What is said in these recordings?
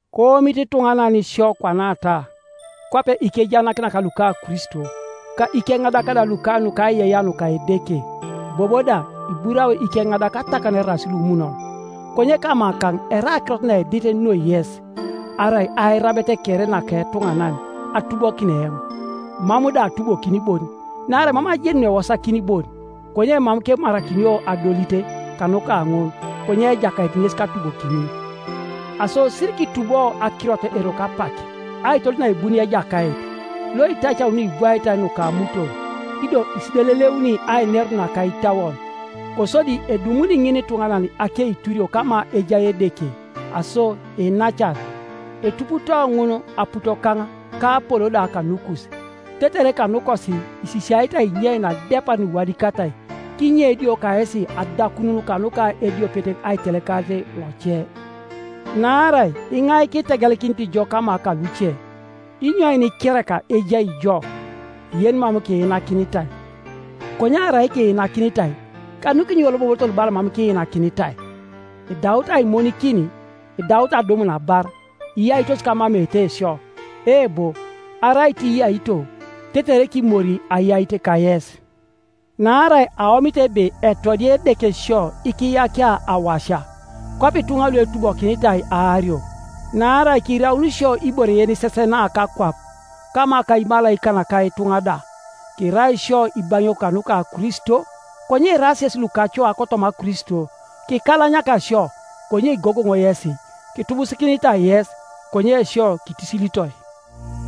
Koomit ituŋanan sio kwanata, kwape ikejaanakinak luka Kristo, ka ikeŋadak da luka nukaiyeiyea nuka Edeke. Bobo da iburao ikeŋadak atakan eraas lumunon. Konye kamakaŋ erai akirot naedit noi yes, arai airabet kere naka etuŋanan, atubokin eoŋ. Mam da atubokin bon. Naarai mam ajeni nuewosakin bon, konye mam kemarakinio adolit kanuka ŋun, konye Ejakait ŋes katubokini. Aso sirikitubo akirot eroko apak, aitodol naebunio Ejakait, loitacauni nuibwaitai nuka amuton, ido isideleleuni ainerun naka itauon. Kosodi edumuni ŋinituŋanan akeiturio kama ejai Edeke. Aso iinacan, etuputoo ŋun aputokaŋ ka Apolo da kanukus, tetere kanukosi isisiaete ainyein adepar nuiwadikatai, kinye idio kayesi adakanun kanuka ediopet aitelekarit loce. Naarai iŋai kitegelikinit jo kama kaluce? Inyoin kereka ejai jo yenimam kiinakinitai? Konye arai kiinakinitai, kanukinyo iwolobobotor bala mam kiinakinitai? Idaut aimonikin! Idaut adumun abar! Iyaitos kamameete isio! Eebo, arai tiiyaito, tetere kimori ayait kayes! Naarai aomit ebe etodia Edeke sio ikiyakia awasia, kwape ituŋa luetubokinitai aario: naarai kiraun isio ibore yenisesena kakwap, kama ka imalaikan ka ituŋa da. Kirai isio ibaŋiok kanuka Kristo, konye iraas yesi lukacoa kotoma Kristo, Kikalanyaka isio, konye igogoŋ yesi. Kitubusikinitai yes, konye sio kitisilitoi.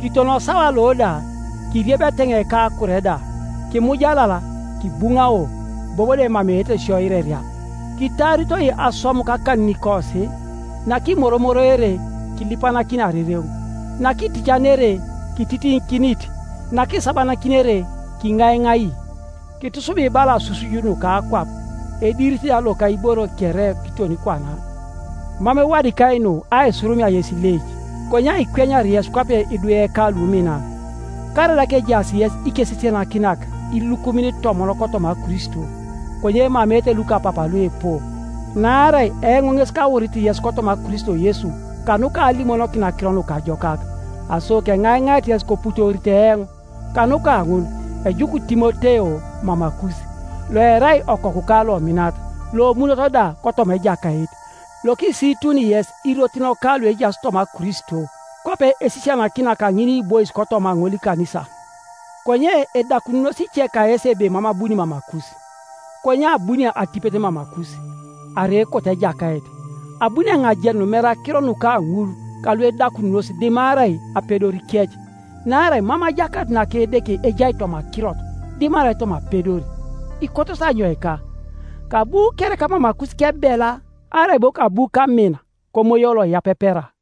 Kiton osawa lo da, kiriebi eteŋei ka akure da, kimujalal, kibuŋao, bobo da emameete sio ireria, kitaaritoi aswam kakaninikosi. Nakimoromoroere, kilipanakini arereŋ; nakiticanere, kititiŋikinit; nakisabanakinere, kiŋaiŋai; kitusubi bala asusuj nuka akwap, ediirit da loka iboro kere, kiton kwana. Mam ewadikai nu aisurumia yes ileic, konye aikwenyar yes kwape idweka luminan. Karaida kejaas yes ikesisianakinak ilukumin itomon kotoma Kristo, konye emameete lukapapa luipu. Naarai eoŋ ŋes kaurit yes kotoma Kristo Yesu kanuka alimonokin Akiro Nukajokak. Aso keŋaiŋait yes koputoorito eoŋ. Kanuka ŋun ejuk Timoteo mamakus, loerai okokuka lominat, lomunot da kotoma Ejakait, lokisiituni yes irotinika luejaas toma Kristo, kwape esisianakinia kaŋiniibois kotoma ŋolikanisa. Konye edakanunos ice kayesi ebe mam abuni mamakus. Konye abuni atipet mamakus, arai ekot Ejakait, abuni eoŋ ajenun mere akiro nuka ŋul kaluedakanunos dimarai apedorikec. Naarai mam ajakanut naka Edeke ejai toma akirot, dimarai toma apedor. Ikotosi anyoika? Kabu kereka mamakus kebela, arai bo kabu kamin komoyo loiyapepera?